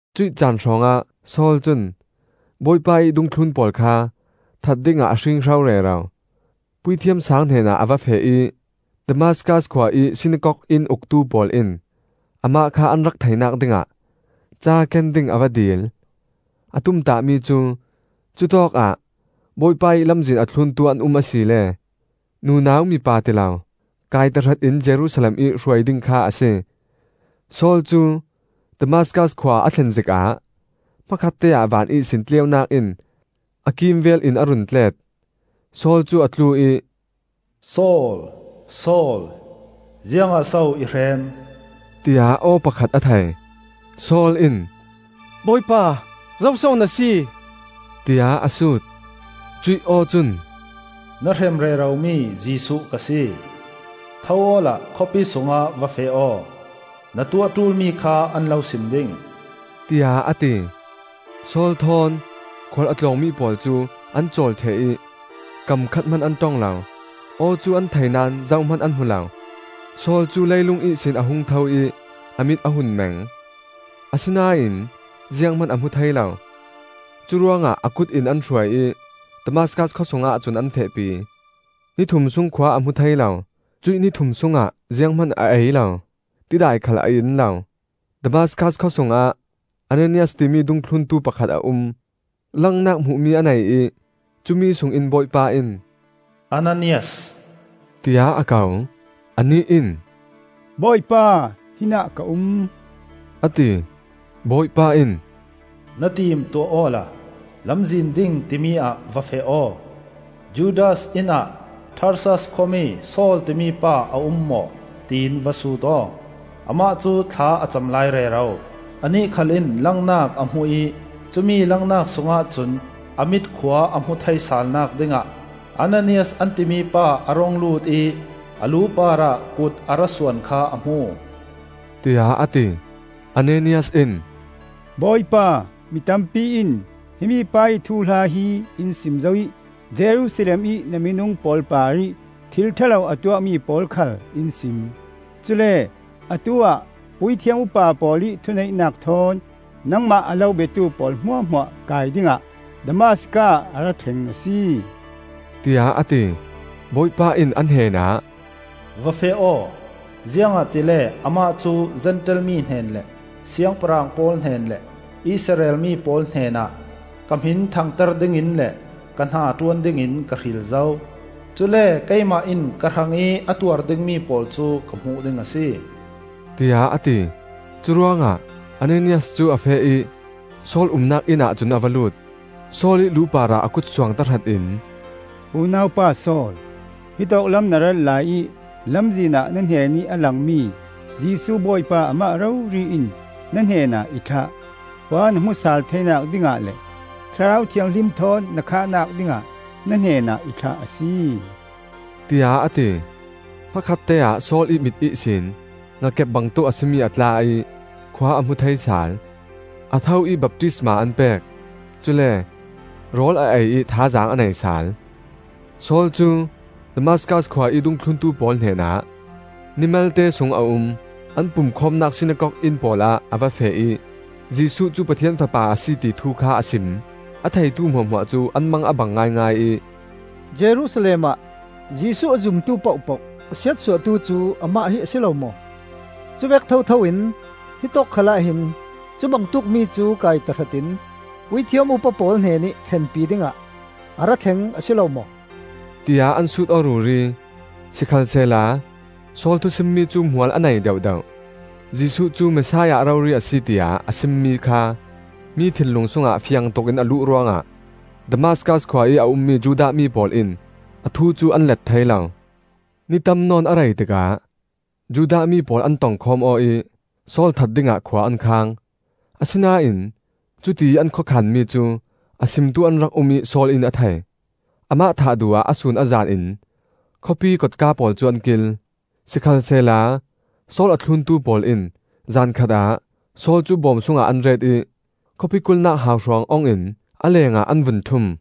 Cuih caan hrawngah Saul cun Bawipa ih dungthlun pawl kha that dingah a hringhro rero. Puithiam Saang hnenah a va feh ih, Damaskas khua ih sinakok inn uktu pawl in amah kha an rak theihnak dingah ca ken ding a va dil. A tumtahmi cu cutawkah Bawipa ih Lamzin a thluntu an um asile nunau mipa tilo kai tahratin Jerusalem ih hruai ding kha a si. Saul cu Damaskas khua a thlen zikah hmakhatte ah van ihsin tleunak in a kimvelin a run tlet. Saul cu a tlu ih, “Saul, Saul, ziangah so i hrem?” tiah aw pakhat a thei. Saul in, “Bawipa, zoso na si?” tiah a sut. Cuih aw cun, “Na hrem reromi Jesuh ka si. Tho awla khawpi sungah va feh aw; na tuah ṭulmi kha an lo sim ding,” tiah a ti. Saul thawn khual a tlawngmi pawl cu an cawl ṭheh ih kam khat hman an ṭong lo; aw cu an thei naón zohman an hmu lo. Saul cu leilung ihsin a hung tho ih a mit a hun meng, asinain zianghman a hmu thei lo. Curuangah a kut in an hruai ih Damaskas khua sungah cun an fehpi. Ni thum sung khua a hmu thei lo; cuih ni thum sungah zianghman a ei lo, tidai khal a in lo. Damaskas khawsungah Ananias timi dungthluntu pakhat a um. Langnak hmuhmi a nei ih cumi sungin Bawipa in, “Ananias!” tiah a ko. Anih in, “Bawipa, hinah ka um,” a ti. Bawipa in, “Na tim tuah awla Lamzin Ding timi ah va feh aw. Judas inn ah Tarsas khuami Saul timi pa a um maw, tiin va sut aw. Amah cu thla a cam lai rero; anih khal in langnak a hmu ih cumi langnak sungah cun a mit khua a hmuh thei salnak dingah Ananias an timi pa a rung lut ih a lu parah kut a ra suan kha a hmu,” tiah a ti. Ananias in, “Bawipa, mi tampi in himi pa ih thuhla hi in sim zo ih Jerusalem ih na minung pawl parih thil ṭha lo a tuahmi pawl khal in sim. Cule atu-ah puithiam upa pawl ih thuneihnak thawn nangmah a lo biatu pawl hmuahhmuah kai dingah Damaskas ah a ra thleng a si,” tiah a ti. Bawipa in a hnenah, “Va feh aw! Ziangahtile amah cu Zentail mi hnen le siangpahrang pawl hnen le Israel mi pawl hnenah ka hmin thangter dingin le ka hnaṭuan dingin ka hril zo. Cule keimah in ka hrangih a tuar dingmi pawl cu ka hmuh ding a si,” tiah a ti. Curuangah Ananias cu a feh ih Saul umnak innah cun a va lut. Saul ih lu parah a kut suang tahrat in, “Unau pa Saul, hitawk lam na rat laiih lamzinah na hnenih a langmi Jesuh Bawipa amah rori in na hnenah i thlah. Khua na hmuh sal theinak dingah le Thlarau Thianghlim thawn na khahnak dingah na hnenah i thlah a si,” tiah a ti. Hmakhatte-ah Saul ih mit ihsin ngakep bangtuk a si mi a tla ih khua a hmu thei sal. A tho ih baptisma an pek. Cule rawl a ei ih thazaang a nei sal. Saul cu Damaskas khua ih dungthluntu pawl hnenah ni malte sung a um. An pumkhawmnak sinakok inn pawlah a va feh ih Jesuh cu Pathian Fapa a si, ti thu kha a sim. A theitu hmuahhmuah cu an mang a bang ngaingai ih, “Jerusalem ah Jesuh a zumtu pohpoh a siatsuahtu cu amah hi a si lo maw? Cuvek thothoin hitawk khalah hin cubangtuk mi cu kai tahratin puithiam upa pawl hnenih thlenpi dingah a ra thleng a si lo maw?” tiah an sut aw ruri. Sikhalsehla Saul thusimmi cu hmual a nei deuhdeuh; Jesuh cu Messiah rori a si tiah a simmi kha mi thinlung sungah fiangtukin a luh ruangah Damaskas khua ih a ummi Judah mi pawl in a thu cu an let thei lo. Ni tam nawn a rei tikah Judah mi pawl an tongkhawm aw ih Saul that dingah khua an khang. Asinain cutiih an khawkhanmi cu a simtu an rak um ih Saul in a thei. Amah thah duh ah a sun a zan in khawpiih kotka pawl cu an kil. Sikhalsehla Saul a thluntu pawl in zan khatah Saul cu bawm sungah an ret ih khawpi kulhnak hauhruang ong in a lengah an vun ṭhum.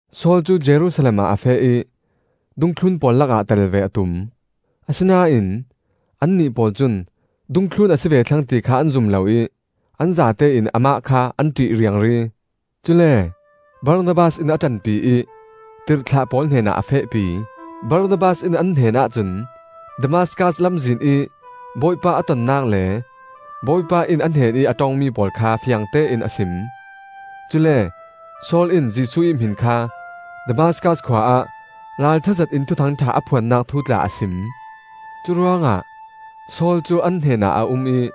Saul cu Jerusalem ah a feh ih dungthlun pawl lakah tel ve a tum. Asinain annih pawl cun dungthlun a si ve thlang ti kha an zum lo ih an zatein amah kha an ṭih riangri. Cule Barnabas in a ṭanpi ih tirhthlah pawl hnenah a fehpi. Barnabas in an hnenah cun Damaskas lamzin ih Bawipa a tonnak le Bawipa in a hnenih a ṭongmi pawl kha fiangtein a sim. Cule Saul in Jesuh ih hmin kha Damaskas khua ah ralṭha zetin thuthang.tha a phuannak thu tla a sim. Curuangah Saul cu an hnenah a um ih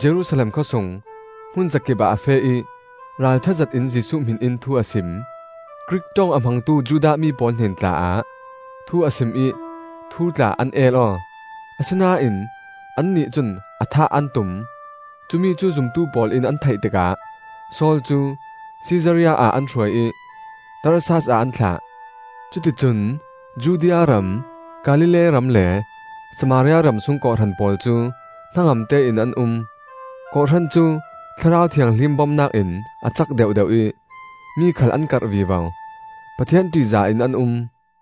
Jerusalem khawsung hmunzakip ah a feh ih ralṭha zetin Jesuh hmin in thu a sim. Grik ṭong a hmangtu Judah mi pawl hnen tla-ah thu a sim ih thu tla an el aw, asinain annih cun a thah an tum. Cumi cu zumtu pawl in an theih tikah Saul cu Sisaria ah an hruai ih Tarsas ah an thlah. Cuti cun Judea ram, Galilee ram le Samaria ram sung kawhhran pawl cu hnangamte in an um. kawhhran cu Thlarau Thianghlim bomnak in a cak deuhdeuh ih mi khal an karh vivo. Pathian ṭihzah in an um.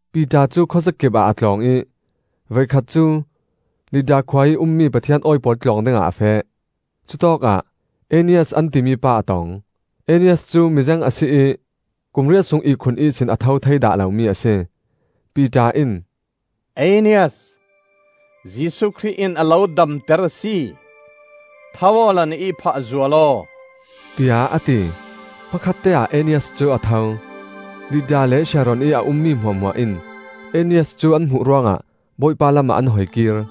Piter cu khuazakipah a tlawng ih voikhat cu Lidda khua ih ummi Pathian awi pawl tlawng dingah a feh. Cutawkah Aenias an timi pa a tong. Aenias cu mizeng a si ih kum riat sung ihkhun ihsin a tho thei dah lomi a si. Piter in, “Aenias, Jesuh Khrih in a lo damter a si. Tho awla na ihphah zual aw,” tiah a ti. Hmakhatte-ah Aenias cu a tho. Lidda le Sharon-ih a ummi hmuahhmuah in Aenias cu an hmuh ruangah Bawipa lamah an hoikir.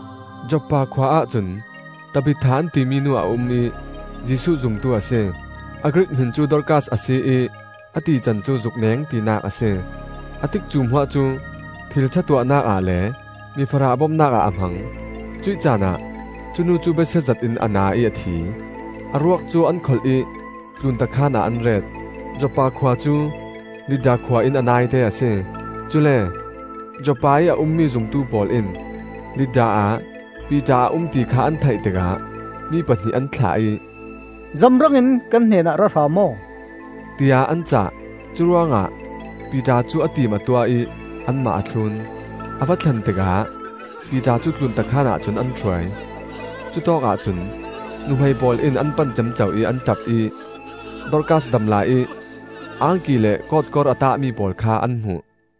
Joppa khua ahcun Tabitha an timi nu a um ih Jesuh zumtu a si. (A Grik hmin cu Dorkas a si ih a tican cu “Zukneng,” tinak a si.) A tikcu hmuah cu thil ṭha tuahnak ah le mifarah bomnak ah a hmang. Cuih caanah cu nu cu besia zetin a na ih a thi. A ruak cu an kholh ih tlunta khaan ah an ret. Joppa khua cu Lidda khua in a naite a si. Cule Joppa ih a ummi zumtu pawl in Lidda ah Piter a um ti kha an theih tikah mi pahnih an thlah ih, “Zamrang in kan hnenah ra hram aw,” tiah an cah. Curuangah Piter cu a tim a tuah ih anmah a thlun. A va thlen tikah Piter cu tlunta khaanah cun an hruai. Cutawkah cun nuhmei pawl in an pan ciamco ih an ṭap ih Dorkas damlai-ih angki le kawtkor a tahmi pawl kha an hmuh.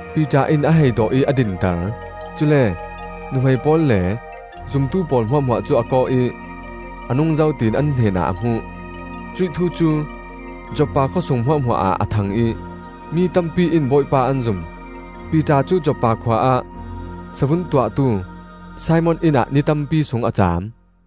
Piter in a hei dawh ih a dinter. Cule nuhmei pawl le zumtu pawl hmuahhmuah cu a kawh ih a nungzo tiin an hnenah a hmuh. Cuih thu cu Joppa khawsung hmuahhmuah ah a thang ih mi tampi in Bawipa an zum. Piter cu Joppa khua ah savun tuahtu Simon inn ah ni tampi sung a caam.